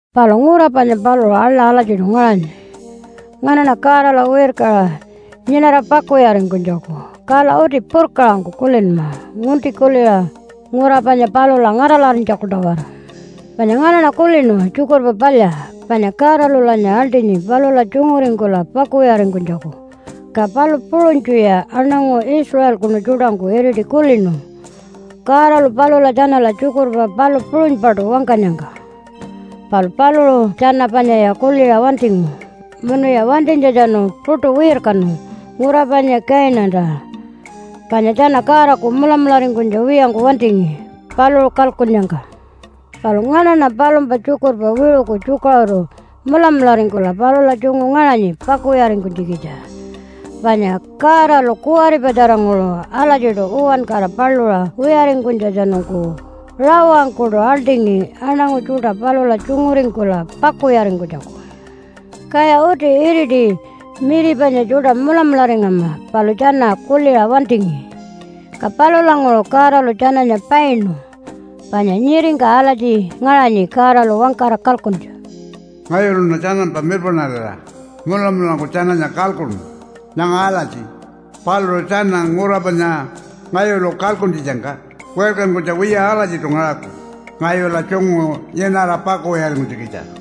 Palu ngura panya paluṟu aḻa alatjiṯu ngaṟanyi nganaṉa Godala wirkaṟa nyinara pakuwiyaringkunytjaku. Kala uti purkaṟangku kulinma, ngunti kuliṟa ngura panya palula ngaṯalarinytjaku-tawara. Panya nganaṉa kulinu Tjukurpa Palya, panya Godalulanya aḻṯinyi palula tjunguringkula pakuwiyaringkunytjaku. Ka palu puṟunytjuya aṉangu Israelkunu tjuṯangku iriti kulinu Godalu palula tjanala tjukurpa palu puṟunypaṯu wangkanyangka. Palu paluṟu tjana panyaya kuliṟa wantingu munuya wantinytjatjanu puṯu wirkanu ngura panya Kainanta, panya tjana Godaku mulamularingkunytja wiyangku wantingi paluṟu kalkunnyangka. Palu nganaṉa palumpa tjukurpa wiṟuku tjukaṟuru mulamularingkula palula tjungu ngaṟanyi pakuwiyaringkunytjikitja. Panya Godalu kuwaripatjaranguṟu alatjiṯu uwankara paluṟa wiyaringkunytjatjanungku rawangkuṯu aḻṯingi aṉangu tjuṯa palula tjunguringkula pakuwiyaringkunytjaku. Kaya uti iriti miri panya tjuṯa mulamularingama, palu tjana kuliṟa wantingi. Ka palulanguṟu Godalu tjananya painu panya nyiringka alatji ngaṟanyi Godalu wangkara kalkuntja, “Ngayuluṉa tjanampa mirpaṉarira mulamulangku tjananya kalkuṉu nyanga alatji, ‘Paluṟu tjana ngura panya ngayulu kalkuntjitjangka wirkankunytja wiya alatjiṯu ngaṟaku ngayula tjungu nyinara pakuwiyaringkunytjikitja.’”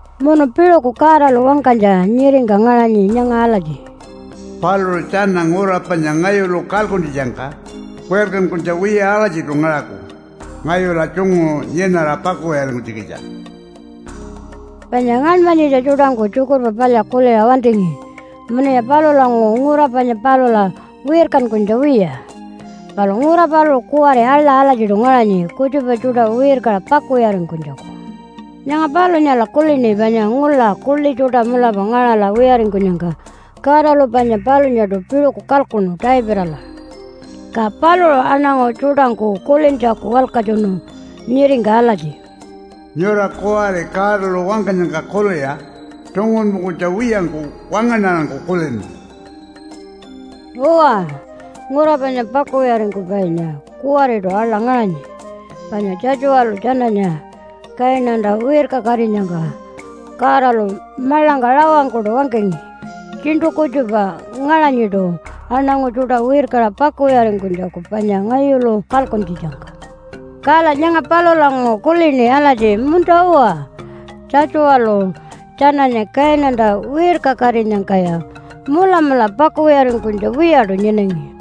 Munu piṟuku Godalu wangkanytja nyiringka ngaṟanyi nyanga alatji, “Paluṟu tjana ngura panya ngayulu kalkuntjitjangka wirkankunytja wiya alatjiṯu ngaṟaku ngayula tjungu nyinara pakuwiyaringkunytjikitja.” Panya ngaṉmanyitja tjuṯangku Tjukurpa Palya kuliṟa wantingi munuya palulanguṟu ngura panya palula wirkankunytja wiya. Palu ngura paluṟu kuwari aḻa alatjiṯu ngaṟanyi kutjupa tjuṯa wirkaṟa pakuwiyaringkunytjaku. Nyanga palunyala kulini panya ngula kuḻi tjuṯa mulapa ngaṟala wiyaringkunyangka Godalu panya palunyaṯu piṟuku kalkuṉu Davidala, ka paluṟu aṉangu tjuṯangku kulintjaku walkatjunu nyiringka alatji, “Nyura kuwari Godalu wangkanyangka kuliṟa tungunpungkunytja wiyangku wangaṉarangku kulinma.” Uwa, ngura panya pakuwiyaringkupainya kuwariṯu aḻa ngaṟanyi, panya Tjatjuwalu tjananya Kainanta wirkakatinyangka Godalu maḻangka rawangkuṯu wangkangi, “Tjiṉṯu kutjupa ngaṟanyiṯu aṉangu tjuṯa wirkaṟa pakuwiyaringkunytjaku panya ngayulu kalkuntjitjangka.” Kala nyanga palulanguṟu kulini alatji, “Munta-uwa, Tjatjuwalu tjananya Kainanta wirkakatinyangkaya mulamula pakuwiyaringkunytja wiyaṯu nyinangi.”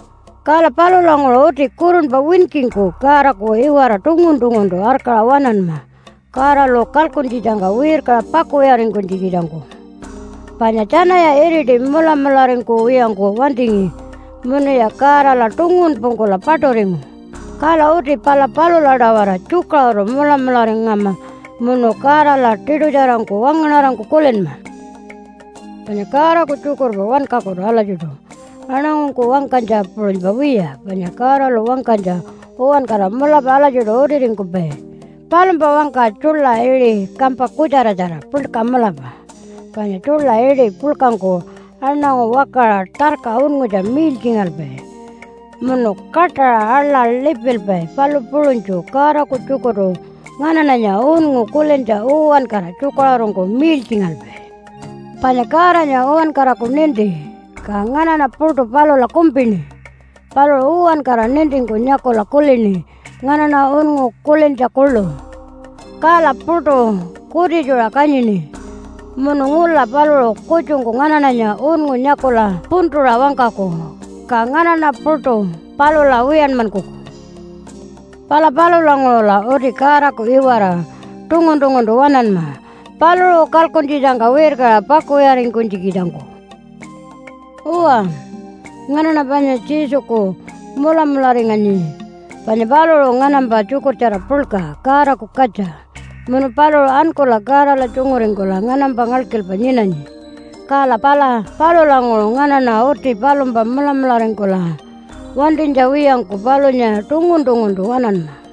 Kala palulanguṟu uti kurunpa winkingku Godaku iwara tungun-tunguntu arkaṟa waṉanma Godalu kalkuntjitjangka wirkaṟa pakuwiyaringkunytjikitjangku. Panya tjanaya iriti mulamularingkuwiyangku wantingi munuya Godala tungunpungkula paṯuringu. Kala uti pala palula-tawara tjukaṟuru mulamularingama munu Godala tiṯutjarangku wangaṉarangku kulinma. Panya Godaku tjukurpa wankakutu alatjiṯu aṉangungku wangkanytja puṟunypa wiya, panya Godalu wangkanytja uwankara mulapa alatjiṯu utiringkupai. Palumpa wangka tjuḻa iṟi kampa kutjaratjara, puḻka mulapa. Panya tjuḻa iṟi puḻkangku aṉangu wakaṟa tarka unngutja miiltjingalpai munu kaṯaṟa aḻa lipilpai, palu puṟunytju Godaku tjukurtu nganaṉanya unngu kulintja uwankara tjukaṟurungku miiltjingalpai. Panya Godanya uwankaraku ninti, ka nganaṉa puṯu palula kumpini. Paluṟu uwankara nintingku nyakula kulini nganaṉa unngu kulintja kuḻu, kala puṯu kutitjuṟa kanyini. Munu ngula paluṟu kutjungku nganaṉanya unngu nyakula puntuṟa wangkaku, ka nganaṉa puṯu palula wiyanmankuku. Pala palulanguṟula uti Godaku iwara tungun-tunguntu waṉanma paluṟu kalkuntjitjangka wirkaṟa pakuwiyaringkunytjikitjangku. Uwa, nganaṉa panya Jesuku mulamularinganyi. Panya paluṟu nganampa tjukurtjara puḻka Godaku katja munu paluṟu ankula Godala tjunguringkula nganampa ngalkilpa nyinanyi. Kala pala palulanguṟu nganaṉa uti palumpa mulamularingkula wantinytja wiyangku palunya tungun-tunguntu waṉanma.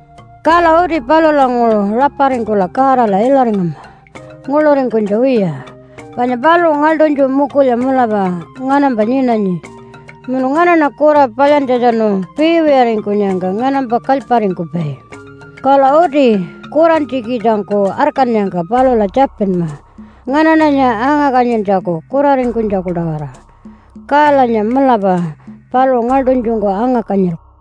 Kala uti palulanguṟu raparingkula Godala ilaringama nguḻuringkunytja wiya. Panya paluṟu ngaḻṯunytju mukulya mulapa nganampa nyinanyi munu nganaṉa kura palyantjatjanu piiwiyaringkunyangka nganampa kalyparingkupai. Kala uti kurantjikitjangku arkannyangka palula tjapinma nganaṉanya anga-kanyintjaku kuraringkunytjaku-tawara, kalanya mulapa paluṟu ngaḻṯunytjungku anga-kanyilku.